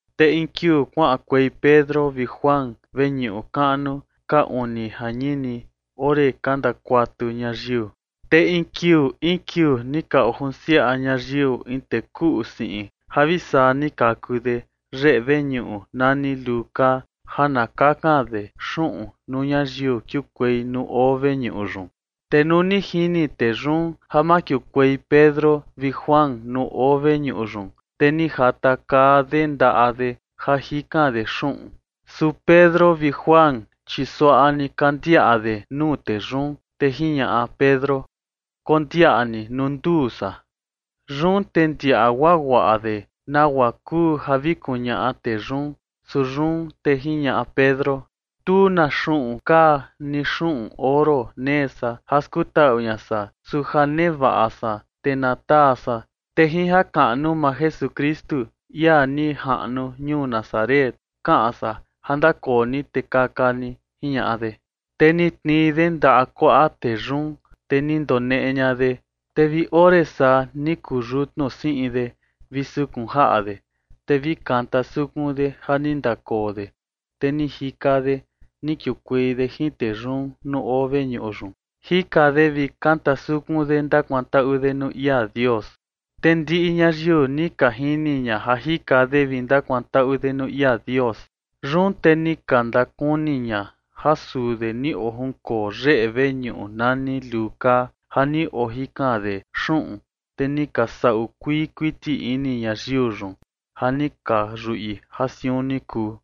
Te in kiuu kuaꞌankuei Pedro vi Juan veñuꞌu kaꞌnu ka uni jañini, ore ka ndakuatu ñayiu. Te in kiuu in kiuu ni ka ojunsiaꞌa ñayiu in tee kuꞌu siꞌin ja vi saa ni kaku de yeꞌe veñuꞌu nani Luu Kaa, ja na kakan de xuꞌun nuu ñayiu kiukuei nuu oo veñuꞌu yun. Te nuu ni jini tee yun ja makiukuei Pedro vi Juan nuu oo veñuꞌu yun, te ni jatakaa de ndaꞌa de ja jikan de xuꞌun. Su Pedro vi Juan, chi suaꞌa ni ka ndiaꞌa de nuu tee yun, te jiñaꞌa Pedro: ―Kondiaꞌa ni nuu nduu san. Yun te ndiaꞌa guaguaꞌa de nagua kuu ja vi kuñaꞌa tee yun. Su yun te jiñaꞌa Pedro: ―Tu na xuꞌun kaa ni xuꞌun oro nee san ja skutaꞌu ña san. Su ja nevaꞌa san, te na taa san. Te jin jakaꞌnu maa Jesukristu, ia ni jaꞌnu ñuu Nazaret, kaꞌan san ja ndakoo ni te kaka ni ―jiñaꞌa de. Te ni tnii de ndaꞌa kuaꞌa tee yun, te ni ndoneꞌe ña de, te vi ore saa ni kuyutnu siꞌin de vi sukun jaꞌa de. Te vi ni kanta sukun de ja ni ndakoo de, te ni jika de ni kiukuei de jin tee yun nuu oo veñuꞌu yun. Jika de vi kanta sukun de ndakuantaꞌu de nuu ia Dios. Te ndiꞌi ñayiu ni ka jini ña ja jika de vi ndakuantaꞌu de nuu ia Dios. Yun te ni ka ndakuni ña ja suu de ni ojunkoo yeꞌe veñuꞌu nani Luu Kaa ja ni ojikan de xuꞌun, te ni ka saꞌu kuii kuiti ini ñayiu yun ja ni ka yuꞌi ja siun ni kuu.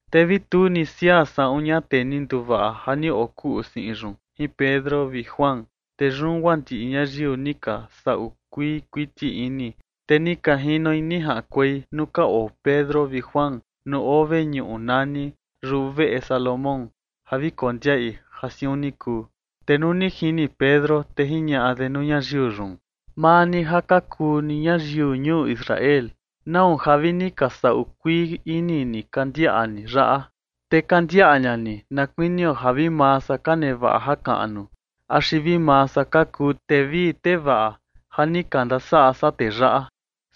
Te vi tu ni siaa saꞌun ña tee ni nduvaꞌa ja ni okuꞌu siꞌin yun jin Pedro vi Juan. Te yun guaa ndiꞌi ñayiu ni ka saꞌu kuii kuiti ini, te ni ka jinoi ni jaꞌankuei nuu ka oo Pedro vi Juan nuu oo veñuꞌu nuu nani Yuveꞌe Salomón ja vi kondiaꞌi ja siun ni kuu. Te nuu ni jini Pedro, te jiñaꞌa de nuu ñayiu yun: ―Maa ni ja ka kuu ni ñayiu ñuu Israel, ¿nau ja vi ni ka saꞌu kuii ini ni ka ndiaꞌa ni yaꞌa? Te ka ndiaꞌa ña ni na kuinio ja vi maa san ka nevaꞌa jakaꞌnu axi vi maa san ka kuu tee vii tee vaꞌa ja ni ka ndasaꞌa san tee yaꞌa.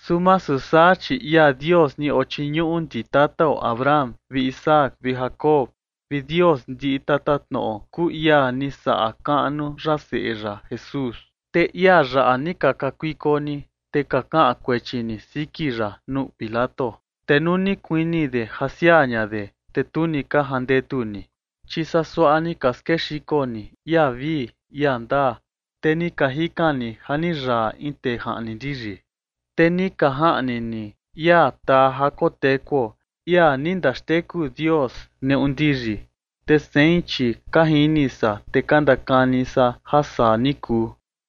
Su masu saa, chi ia Dios ni ochiñuꞌu ndi tatao Abraham vi Isaac vi Jacob, vi Dios ndiꞌi tatatnoꞌo kuu ia ni saꞌa kaꞌnu ya seꞌe ya Jesús, te ia yaꞌa ni ka kakuiko ni, te ka kaꞌan kuechi ni siki ya nuu Pilato. Te nuu ni kuini de ja siaa ña de, te tu ni ka jandetu ni. Chi saa suaꞌa ni ka skexiko ni ia vii ia ndaa, te ni ka jikan ni ja ni yaa in tee jaꞌni ndiyi. Te ni ka jaꞌni ni ia taa ja kotekuo, ia ni ndaxteku Dios neꞌu ndiyi. Te sein, chi ka jini san te ka ndakani san ja saa ni kuu.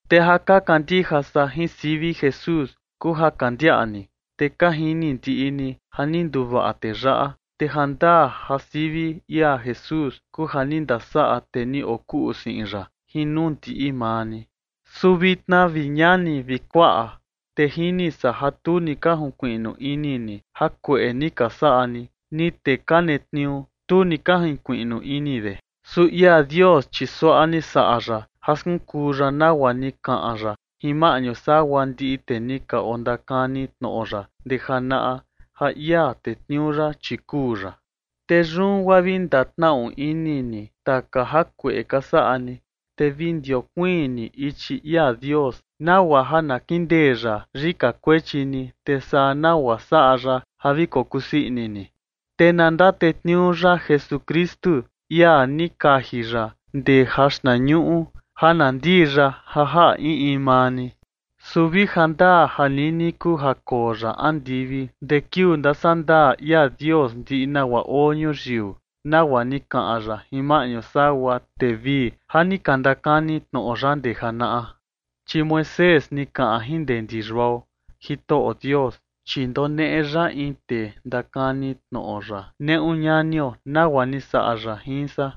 Te ja ka kandija san jin sivi Jesús kuu ja ka ndiaꞌa ni, te ka jini ndiꞌi ni, ja ni nduvaꞌa tee yaꞌa, te jandaa ja sivi ia Jesús kuu ja ni ndasaꞌa tee ni okuꞌu siꞌin yaꞌa jin nuu ndiꞌi maa ni. ’Su vitna, vi ñani vi kuaꞌa, te jini san ja tu ni ka jinkuiꞌnu ini ni jakueꞌe ni ka saꞌa ni, ni tee ka netniuu, tu ni ka junkuiꞌnu ini de. Su ia Dios, chi suaꞌa ni saꞌa ya ja skunkuu ya nagua ni kaꞌan ya jin maꞌñu sagua ndiꞌi tee ni ka ondakani tnoꞌo ya ndee janaꞌa ja ia tetniuu ya, chi kuu ya. Te yun guaa vi ndatnaꞌu ini ni taka jakueꞌe ka saꞌa ni, te vi ndiokuiin ni ichi ia Dios, nagua ja na kindee ya yika kuechi ni, te saa nagua ja saꞌa ya ja vi kokusii ini ni. Te na ndatetniuu ya Jesukristu, ia ni kaji ya ndee jaxtnañuꞌu ja na ndii ya ja jaꞌa in in maa ni. Su vi jandaa ja nini kuu ja koo ya andivi ndee kiuu ndasandaa ia Dios ndiꞌi nagua oo ñuyiu, nagua ni kaꞌan ya jin maꞌñu sagua tee vii ja ni ka ndakani tnoꞌo ya ndee janaꞌa. Chi Moisés ni kaꞌan jin ndee ndi yuao: “Jitoꞌo Dios, chi ndoneꞌe ya in tee ndakani tnoꞌo ya neꞌu ñanio nagua ni saꞌa ya jin san,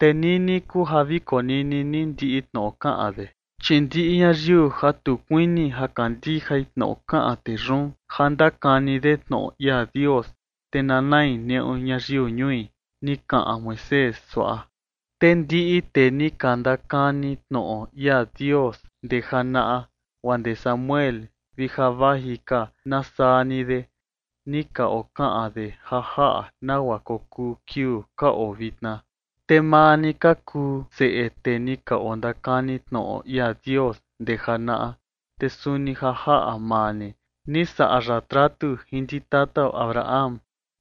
te nini kuu ja vi konini ni ndiꞌi tnoꞌo kaꞌan de. Chi ndiꞌi ñayiu ja tu kuini ja kandijai tnoꞌo kaꞌan tee yun ja ndakani de tnoꞌo ia Dios, te na nai neꞌu ñayiu ñui”, ni kaꞌan Moisés suaꞌa. ’Te ndiꞌi tee ni ka ndakani tnoꞌo ia Dios ndee janaꞌa, guaa ndee Samuel vi ja vaji ka na saa ni de, ni ka okaꞌan de ja jaꞌa nagua kokuu kiuu ka oo vitna. Te maa ni ka kuu seꞌe tee ni ka ondakani tnoꞌo ia Dios ndee janaꞌa, te suni ja jaꞌa maa ni ni saꞌa ya tratu jin ndi tatao Abraham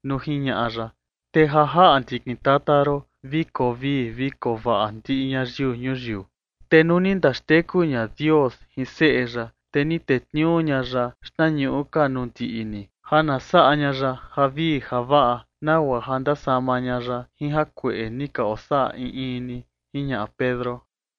nuu jiñaꞌa ya: “Te ja jaꞌa ndikin tata ron vi koo vii vi koo vaꞌa ndiꞌi ñayiu ñuyiu”. Te nuu ni ndaxteku ña Dios jin seꞌe ya, te ni tetniuu ña ya xtnañuꞌu ka nuu ndiꞌi ni ja na saꞌa ña ya javii javaꞌa, nagua ja ndasama ña ya jin jakueꞌe ni ka osaꞌa in in ni ―jiñaꞌa Pedro.